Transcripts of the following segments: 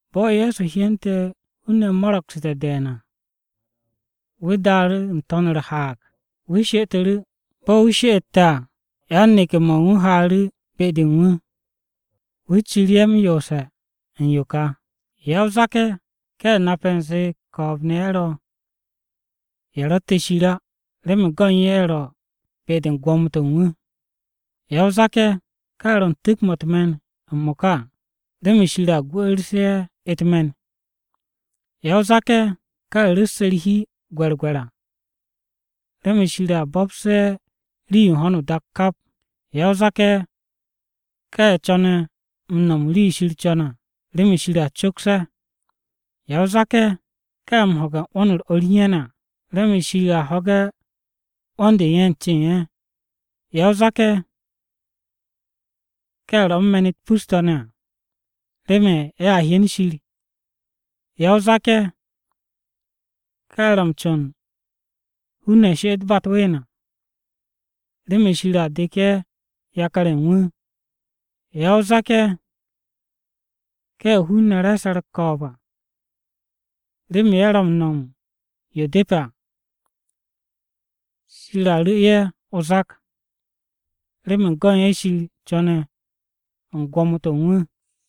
Bo̱ Ye̱so hyente̱ hun-ne̱ mo̱ro̱gsu̱te̱ de̱e̱n à, wu̱ daaru̱ n-to̱n u̱r-haag, wu̱ she'etu̱ru̱. Bo̱ wu̱ she'ette̱ à, yan-neke̱-mo̱ u̱n wu̱ haaru̱ be-de u̱n wu̱. Wu̱ ciru̱ ye̱ m-yoose̱ u̱n yo ka: “Ya-o-zak-ye̱, ka ye̱ nape̱ u̱nze ko̱o̱b-ne̱ ye̱ ro̱, ye̱ ro̱tte̱ Shir á, remen go̱n ye̱ ro̱ be-de u̱n gwo̱mo-to̱ u̱n wu̱. Ya-o-zak-ye̱, ka ye̱ ro̱ u̱n tu̱k-mo̱ u̱t-me̱n m-mo̱ka à, remen Shir a gwu̱'u̱rsu̱ ye̱ u̱t-me̱n. Ya-o-zak-ye̱, ka ye̱ ru̱sse̱ u̱r-hi gwe̱rgwe̱r à, remen Shir a bo̱psu̱ ye̱ rii-yo u̱n ho̱no o-dak kap. Ya-o-zak-ye̱, ka ye̱ co̱ne̱ m-nom rii-yo Shir co̱ne̱ à, remen Shir a coks ye̱. Ya-o-zak-ye̱, ka ye̱ m-ho̱ge̱ 'wo̱n-u̱r o̱r u̱n ye̱ ne̱ à, remen Shir a ho̱ge̱ 'wo̱n-de u̱n ye̱ u̱n cen ye̱. Ya-o-zak-ye̱, ka ye̱ ro̱ u̱n me̱n-u̱t pus-to̱ ne̱ à, remen ye̱a hyen Shir. Ya-o-zak-ye̱, ka ye̱ ro̱ m-co̱n hun-ne̱ she'et ba u̱t-ween à, remen Shir a dek ye̱ yakar-ye̱ u̱n wu̱.” Ya-o-zak-ye̱, ka ye̱ hun-ne̱ re̱e̱se̱ u̱r-ko̱o̱b à, remen ye̱ ro̱ m-no̱m u̱n yo depe̱ à, Shir a ru̱ ye̱ o-zak, remen go̱n ye̱ Shir co̱ne̱ u̱n gwo̱mo-to̱ u̱n wu̱.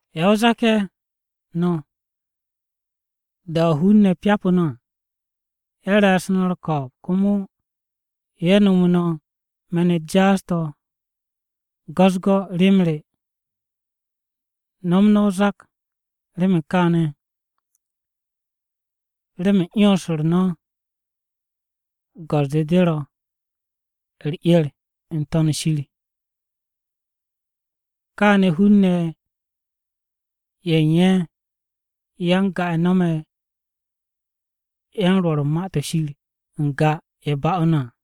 Ya-o-zak-ye̱ no̱, da-o̱ hun-ne̱ pyapu̱ no̱ à, ye̱ re̱e̱su̱ no̱ u̱r-ko̱o̱b, komo ye̱ nomo no̱ me̱n-u̱t jaas-to̱ go̱-u̱s-go̱ rem re. Nom no̱ o-zak remen kaane̱, remen 'yons-u̱r go̱s-de ro̱ no̱ u̱r-'er n-To̱n shir. Kaane̱ hun-ne̱ ye̱ u̱n ye̱ ya-n-ga-ye̱ nome̱ yan-Rwo̱r u̱n Ma-to̱ Shir n-ga, ye̱ ba'u̱ no̱ à.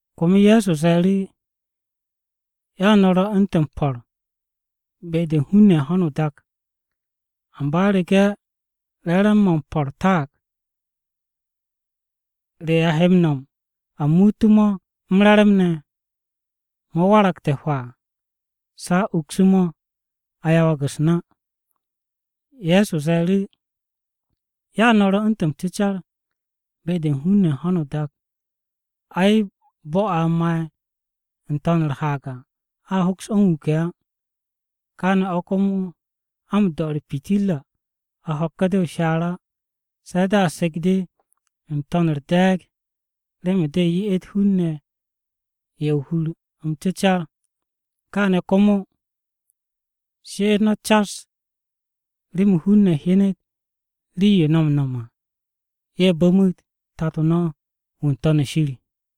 Komo Ye̱so ze̱e̱ru̱, “Ya no̱ ro̱ u̱ntu̱ m-po̱r be-de u̱n hun-ne̱ ye̱ u̱n ho̱no o-dak. Amba u̱rege̱ re̱re̱m-mo̱ m-po̱r taag, ¿re a he m-nom a muute̱ mo̱ m-re̱re̱m ne̱? Mo̱ waragte̱ hwaa, se̱ a ukse̱ mo̱, a yawag u̱s-na.” Ye̱so ze̱e̱ru̱, “Ya no̱ ro̱ u̱ntu̱ m-cecar be-de u̱n hun-ne̱ ye̱ u̱n ho̱no o-dak. Ai, bo̱-o̱ a ma'e̱ n-to̱n u̱r-haag à a hoks o̱ m-wuke̱ á. Kaane̱ o̱ komo a m-do̱ u̱r-pitirra a ho̱k de o-shaar á, se̱ de̱ a sek de n-to̱n u̱r-de̱e̱g remen de ye'et hun-ne̱ ye̱ o-hur m-cecar. Kaane̱ komo, she'et no̱ cas remen hun-ne̱ hyenet rii-yo no̱ m-no̱m à, ye̱a bu̱m Tato no̱ wu̱ n-To̱n shir.”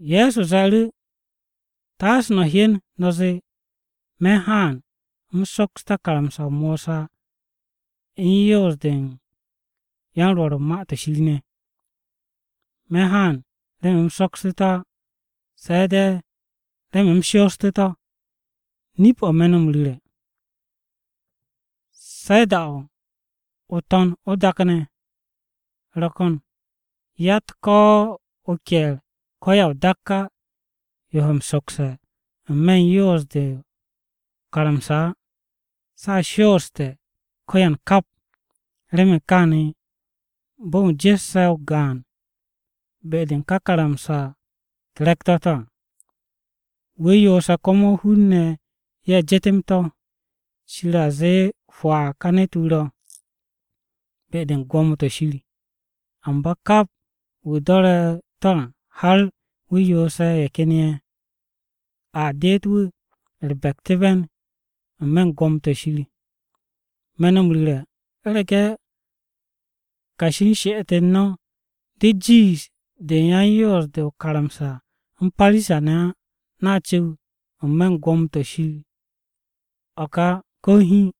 Ye̱so ze̱e̱ru̱, “Taase no̱ hyen no̱ zee me̱n haan u̱m soksté̱ karamsa-o Mosa u̱n yoos-de u̱n yan-Rwo̱r u̱n Ma-to̱ Shir ne̱. Me̱ haan remen u̱m soksté̱ to̱ á, se̱ de̱ remen u̱m shoosté̱ to̱. Nip-o̱ me̱ no̱ m-ru̱re̱, u̱rege̱ de̱ o-To̱n o-dak ne̱ ro̱ ko̱n, yatt ko̱ o-ke̱e̱r ko̱ ya-o-dakka yo he m-sokse̱ n-me̱ u̱n yoos-de o-karamsa á. Se̱ a shooste̱ ko̱yan kap. Remen kaane̱ bo̱ u̱n wu̱ jesse̱ ko̱ o-gaan be-de u̱n ka karamsa-u̱t re̱k-to̱ to̱ à, wu̱ yoose̱ komo hun-ne̱ ye̱ jetem to̱. Shir a zee hwaa ka ne̱t-wu̱ ro̱ be-de u̱n gwo̱mo-to̱ Shir. Amba kap wu̱ do̱re̱ to̱ à har wu̱ yoose̱ ye̱ ken ye̱, a deet wu̱ u̱r-bektu̱be̱n n-me̱ u̱n gwo̱mo-to̱ Shir. “Me̱ no̱ m-ru̱re̱, u̱rege̱ kashi u̱n she'et-u̱r no̱ de jiish de u̱n yan-Yoos-de o-karamsa u̱n Parisa-ne̱ á, no̱a cu̱w n-me̱ u̱n gwo̱mo-to̱ Shir á ko̱ hiin.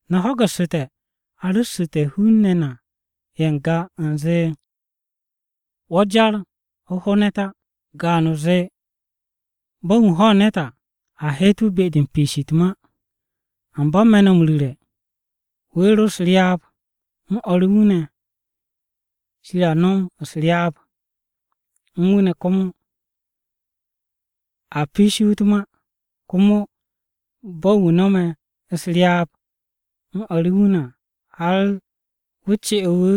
“No̱ ho̱gu̱ssu̱te̱ a ru̱ssu̱te̱ hun-ne̱ na ye̱ n-ga, u̱nze, ‘Wo̱ jar o ho ne̱t á,’ gaan-o zee ‘bo̱ u̱n wu̱ ho̱ ne̱t à, a he'et wu̱ be-de u̱n piishi wu̱ u̱t-ma.’ Amba me̱ no̱ m-ru̱re̱, wu̱ ro̱ u̱s-ryaab u̱n o̱r u̱n wu̱ ne̱ à, Shir a nom u̱s-ryaab u̱n wu̱ ne̱ komo a piishe̱ wu̱ u̱t-ma. Komo bo̱ u̱n wu̱ no̱me̱ u̱s-ryaab u̱n o̱r u̱n wu̱ ne̱ à, har wu̱ ce'e̱ wu̱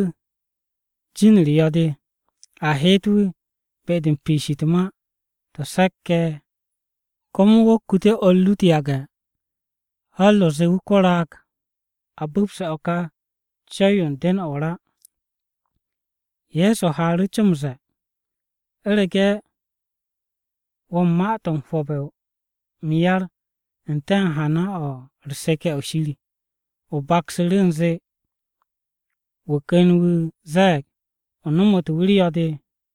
jin-u̱r yo̱-de a he'et wu̱ be-de m-piish u̱t-ma to̱ se̱k-ye̱ u̱n Shir. Komo wo̱ kute̱ o̱r ru u̱t-yage̱ har o zee wu̱ ko-raag! To̱, o bu̱pse̱ o̱ ka co̱w-yo u̱n den-o̱ o-ra!” Ye̱so haaru̱ co m-ze̱e̱, “U̱rege̱ wo̱ u̱n ma-to̱ m-hwo̱bbe̱ m-yar n-te̱ u̱n hana-o̱ u̱r-seke̱ o̱ Shir, o baksu̱ru̱ u̱nze wu̱ ken wu̱ ze̱e̱g o nomote̱ wu̱ u̱r-yo̱-de,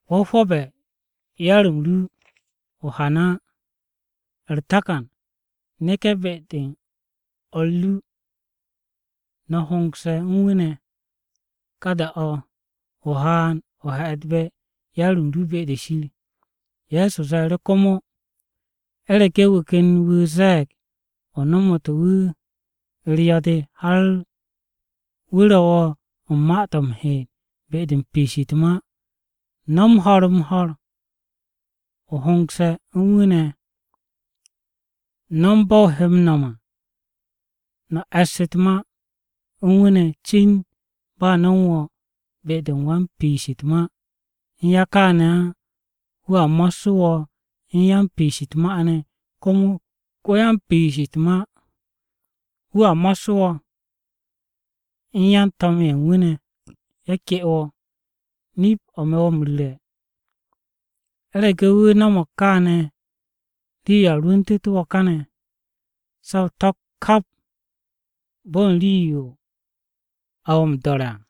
Wo̱ hwo̱be̱ yar-m ru o-hana á. U̱r-takan neke̱ be-de u̱n o̱r ru no̱ hongse̱ u̱n wu̱ ne̱. Ka da-de o haan o he̱'e̱dbe̱ yar-m ru be-de Shir.” Ye̱so ze̱e̱ru̱ komo, “U̱rege̱ wu̱ ken wu̱ ze̱e̱g o nomote̱ wu̱ u̱r-yo̱-de har wu̱ ro̱ wo̱ u̱n ma-to̱ m-heet be-de u̱n m-piish u̱t-ma, no̱m ho̱r-m-ho̱r o hongse̱ u̱n wu̱ ne̱. No̱m bo̱ o he m-no̱m à no̱ e̱ss u̱t-ma u̱n wu̱ ne̱ cin ba no̱ u̱n wo̱o̱ be-de u̱n m-piish u̱t-ma. U̱nya kaane̱ á, wu̱a mo̱ssu̱ wo̱ u̱n wan-piish u̱t-ma ne̱. Komo ko-ya-m-piish u̱t-ma wu̱a mo̱ssu̱ wo̱ u̱n yan-to̱m-ye̱ u̱n wu̱ ne̱ ye̱ ke wo̱. Nip-o̱ me̱ wo̱ m-ru̱re̱, u̱rege̱ wu̱ no̱mo̱g kaane̱, rii-yo a rwu̱ntu̱tu̱ wo̱ kane̱, se̱ o to̱pk kap bo̱ u̱n rii-yo a wo̱ m-do̱re̱ à.”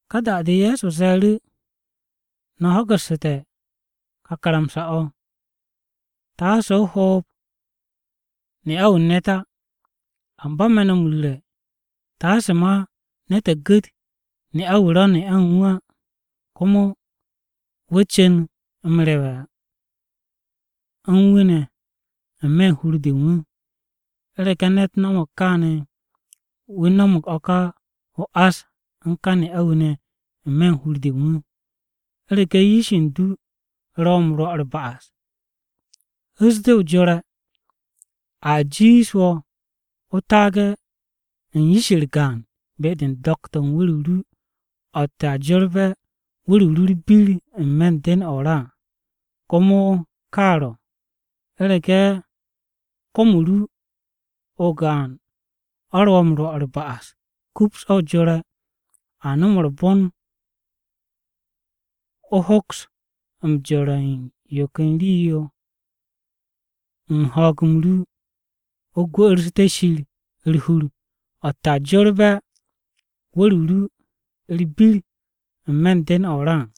Ka da-de Ye̱so ze̱e̱ru̱, “No̱ ho̱gu̱ssu̱te̱ ka karamsa-o̱, ‘Taase o hoob ne'a-wu̱ u̱n ne̱t á.’ Amba me̱ no̱ m-ru̱re̱, taase ma ne̱t gu̱t ne'a-wu̱ ro̱ ne'a u̱n wu̱ á komo wu̱ cu̱n m-rewe̱ u̱n wu̱ ne̱ n-me̱ u̱n hur-de u̱n wu̱. U̱rege̱ ne̱t no̱mo̱g káane̱, wu̱ no̱mo̱g o-ás o̱ ka u̱n wu̱ ne̱ n-me̱ u̱n hur-de u̱n wu̱. U̱rege̱ yish u̱n du ro̱ wo̱ m-rwo̱ u̱r-ba'as, hu̱s de o jore̱. A jiish wo̱ o taage̱ yish-u̱r gaan be-de u̱n do̱k-to̱ u̱n wu̱r-o ru o̱tte̱ a jorbe̱ wu̱r-o ru u̱r-bir n-me̱ den-o̱ o-ra à. Komo ka ro̱, u̱rege̱ kom-o ru o-gaan ro̱ wo̱ m-rwo̱ u̱r-ba'as, kups o̱ o jore̱. A nom u̱r-bon wo̱ hokse̱ jore̱ u̱n yo ken rii-yo u̱n ho̱o̱g-m ru o gwu̱'u̱rsu̱te̱ Shir u̱r-hur, o̱tte̱ a jorbe̱ wu̱r-o ru u̱r-bir n-me̱ u̱n den-o̱ o-ra à.”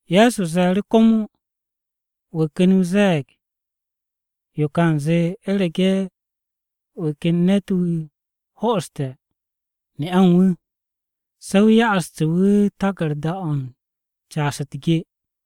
Ye̱so ze̱e̱ru̱ komo, “Wu̱ ken wu̱ ze̱e̱g yo ka u̱nze ‘U̱rege̱ wu̱ ken ne̱t-wu̱ ho'oste̱ ne'a u̱n wu̱, se̱ wu̱ ya'astu̱ wu̱ taku̱rda-o̱ u̱n caas u̱t-ge.’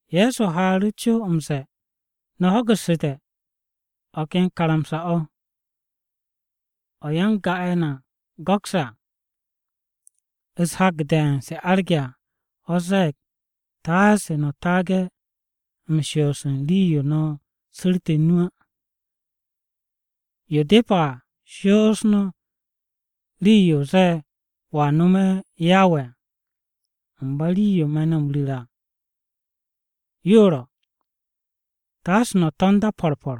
Ye̱so haaru̱ co m-ze̱e̱, “No̱ ho̱gu̱ssu̱te̱ o̱ ken karamsa-o̱, o̱ ya-n-ga-ye̱ na go̱kse̱ à u̱s-hak de̱e̱n se arge̱ à. O̱ ze̱e̱g, ‘Taase no̱ taage̱ m-shoos u̱n rii-yo no̱ su̱rte̱ nu à. Yo depe̱ à shoos rii-yo o zee wo̱a nome̱ Yawe à.’ Amba rii-yo me̱ no̱ m-ru̱re̱ à yo ro̱, taase no̱ to̱nd á po̱r po̱r.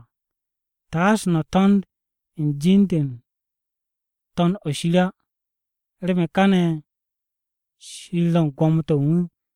Taase no̱ to̱nd u̱n jin-de u̱n To̱n-o̱ shir á, remen káne̱ Shir ro̱ u̱n gwo̱mo-to̱ u̱n wu̱.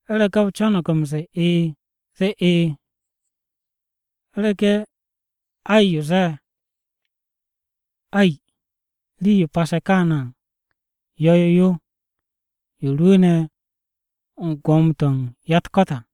U̱rege̱ o co̱no̱g m-ze̱e̱ ‘E̱e̱’ zee ‘E̱e̱,’ u̱rege̱ ‘Ay’ o̱, zee ‘Ay.’ Rii-yo pase̱ kaane̱ à, yo̱-yo yo. Yo rwu̱u̱ne̱ u̱n ko-Gwo̱mo-wu̱ u̱n ya-u̱t-ko̱t à.”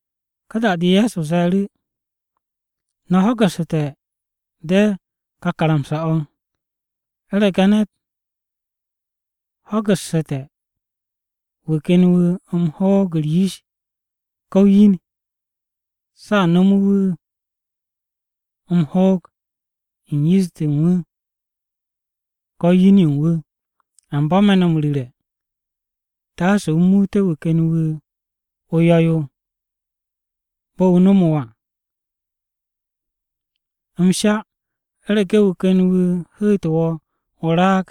Ka da-de Ye̱so ze̱e̱ru̱, “No̱ ho̱gu̱ssu̱te̱ de̱ ka karamsa-o̱, ‘U̱rege̱ ne̱t ho̱gu̱ssu̱te̱ wu̱ ken wu̱ m-hoog u̱r-yish ko̱ o-yin, se̱ a nome̱ wu̱ m-hoog u̱n yish-de u̱n wu̱ ko̱ u̱n yin-yo u̱n wu̱.’ Amba me̱ no̱ m-ru̱re̱, taase o muute̱ wu̱ ken wu̱ o-yo̱ yo bo̱ wu̱ nomo wo̱ à. M-sha u̱rege̱ wu̱ ken wu̱ hu̱tu̱ wo̱ o-raag,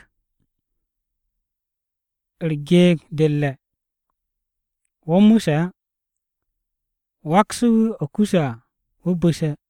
u̱r-geeg de u̱r-re̱, wo̱ mu̱se̱ á wakse̱ wu̱ o̱ kuse̱ à wu̱ bu̱se̱.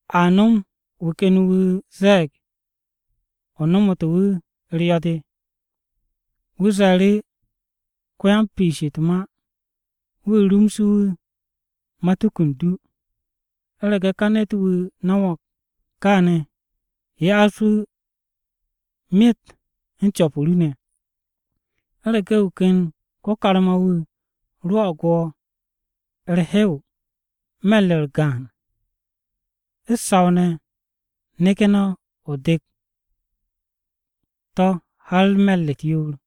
A nom wu̱ ken wu̱ ze̱e̱g o nomote̱ wu̱ u̱r-yo̱-de. Wu̱ ze̱e̱ru̱ ko-yan-m-piish u̱t-ma wu̱ rumse̱ wu̱ matuku u̱n du, u̱rege̱ ka ne̱t-wu̱ no̱mo̱g kaane̱, ya'as wu̱ myet u̱n co̱p-o ru ne̱. U̱rege̱ wu̱ ken ko-karma-wu̱ rwo̱'o̱g wo̱ u̱r-hew me̱r-u̱r gaan, u̱t-saw ne̱ neke̱ o dek to̱ har me̱r-u̱t yoor.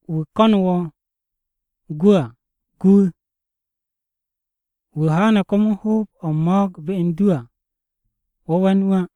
Wu̱ ko̱nu̱ wo̱ gwu̱ à, gu wu̱. Wu̱ haane̱ komo hoob-o̱ u̱n mo̱o̱g be u̱n du à, wo̱ we̱n wu̱ á.”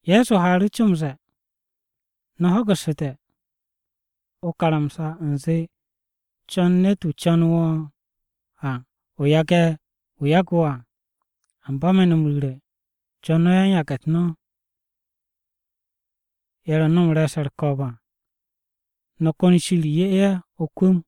Ye̱so haaru̱ co m-ze̱e̱, “No̱ ho̱gu̱ssu̱te̱ o-karamsa u̱nze, ‘Co̱n ne̱t-wu̱ co̱nu̱ wo̱ à,’ o yage̱ wu̱ yagu̱ wo̱ à. Amba me̱ no̱ m-ru̱re̱, co̱n no̱ yan-yage̱-u̱t no̱! Ye̱ ro̱ no̱ u̱n re̱e̱se̱ u̱r-ko̱o̱b à, no̱ ko̱n Shir 'ye ye̱ o-kwu̱m!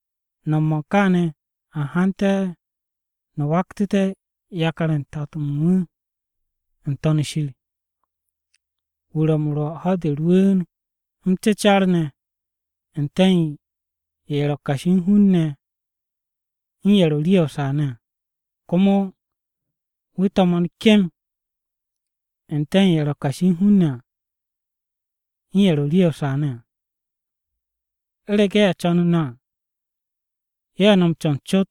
No̱m-mo̱ u̱n kaane̱, a hante̱ no̱ waktu̱te̱ yakar-ye̱ u̱n Tato no̱ wu̱ n-To̱n shir. Wu̱ ro̱ m-rwo̱ ho̱-de rwu̱u̱n m-cecas ne̱ n-te̱ u̱n ye̱ ro̱ kashi u̱n hun-ne̱ u̱n ye̱ ro̱ rii-ye̱ o-saa ne̱ à. Komo wu̱ to̱mo̱n kem n-te̱ u̱n ye̱ ro̱ kashi u̱n hun-ne̱ à, u̱n ye̱ ro̱ rii-ye̱ o-saa ne̱ à. U̱rege̱ ye̱ co̱nu̱ no̱ à, ye̱ no̱ m-co̱n cot,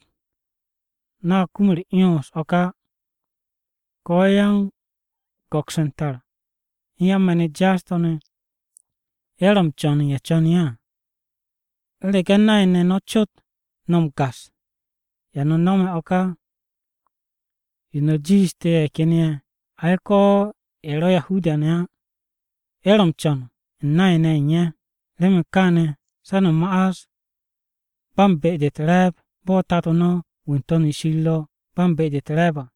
no̱a kum u̱r-'yons o̱ ka á. Ko̱ yan-go̱ks u̱n tar, u̱n yan-me̱n-u̱t jaas-to̱ ne̱, ye̱ ro̱ m-co̱n u̱n ye̱ co̱ne̱ ye̱ à. U̱rege̱ nay-ne̱ no̱ cot no̱ m-gas, ¿ya no̱ no̱me̱ o̱ ka yo no̱ jiishte̱ ye̱ ken ye̱? Ay, ko̱ ye̱ ro̱ Yahuda-ne̱ á, ye̱ ro̱ m-co̱n u̱n nay-ne̱ ye̱ u̱n ye̱. Remen kaane̱ se̱ no̱ ma'as ba u̱n be-de u̱t-re̱e̱b bo̱ Tato no̱ wu̱ n-To̱n shir ro̱ ba u̱n be-de u̱t-re̱e̱b à.”